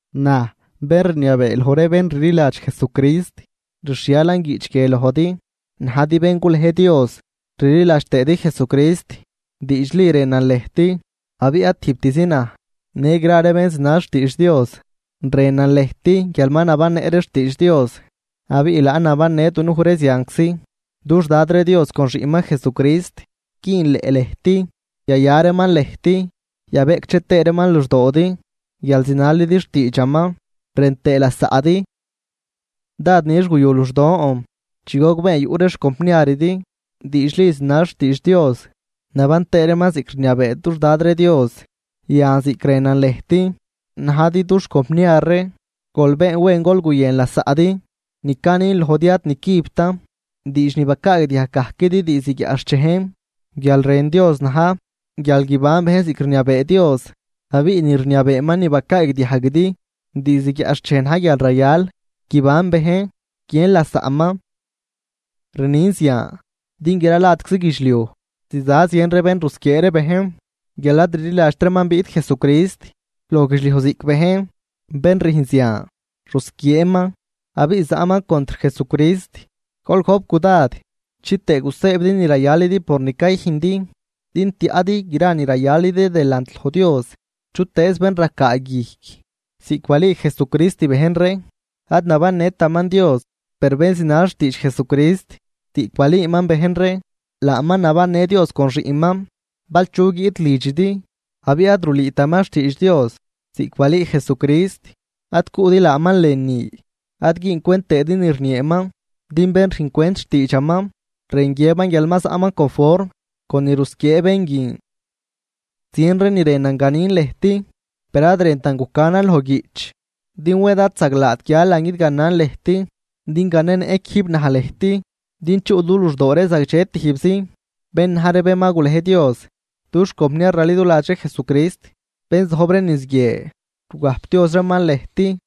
Naj, bén rniabee loj ree bén rliladx Jesucrist, rxhialan guiꞌch guie lojdi najdi bén gulej Dios rliladx tëëdi Jesucrist, diidxli rënan lëjt, abiꞌ ad tijbtizi naj, në gra ree bén zinal xtiidx Dios. Rënan lëjt guial ma nabannëꞌ ree xtiidx Dios abiꞌ laan nabannë dunuj ree zianczi. Dux Dad ree Dios con Xiꞌnman Jesucrist güünleꞌ lëjt, yaya reeman lëjt, yabeꞌcdxe tëë reeman luxdoodi guial zinalidi xtiidxaman rën tëë lasaꞌdi. Dád nix guyu luxdon chi gogbeen yuꞌ ree xcompniaridi, diidxli zinal xtiidx Dios naban tëë reeman ziꞌc rniabee dux Dad ree Dios. Yan, ziꞌc rënan lëjt najdi dux compniar ree, gol been wen gol guyën lasaꞌdi. Ni canin lojdi ad nicübtan, diidx ni bacaagdiajg gajquidi diizd guiaꞌxchejn. Guial rën Dios na̱j guial guiban bejn ziꞌc rniabee Dios, abiꞌ ni rniabeeman ni bacaagdiajguidi diizd guiaꞌxchej na̱j guial rayal guiban bejn, guiën lasaꞌman. Rnin zian, din gra ladczi guidxliuj ziza zien ree bén rusquiee ree bejn, guial ad rliladxt reeman biꞌt Jesucrist loj guidxliuj ziꞌc bejn, bén rüjn zian rusquieeman abiꞌ zaꞌman contr Jesucrist. Gol gojp cudad chitëë gusëëbidi ni rayalidi por ni cayüjndi, din tiaꞌdi gra ni rayalidi delant loj Dios. Chutëëz bén racaa guijc ziꞌc balüü Jesucrist bejn ree ad nabannëtaman Dios, per bén zinal xtiidx Jesucrist ziꞌc balüüman bejn ree, laaman nabannë Dios con Xiꞌnman. Bal chu guiꞌt lidxidi abiꞌ ad rulüütaman xtiidx Dios ziꞌc balüü Jesucrist, ad cuꞌdi laaman lënü, ad güüncwent tëëdi ni rnieeman. Din bén rüjncwent xtiidxaman, rën guiëban guial ma zaꞌman conform con ni rusquiee bén guin. Zien ree ni rënan ganin lëjt, per ad rëntan gucanan loj guiꞌch, din wed ad zaglaat guialan guidganan lëjt din ganenëꞌ quijb naj lëjt din chuꞌ du luxdoo ree zagdxe tijbzi. Bén na̱j ree bén ma gulej Dios, dux compniar raliduladx ree Jesucrist bén zojb ree niz guie, rugajpdioz reeman lëjt.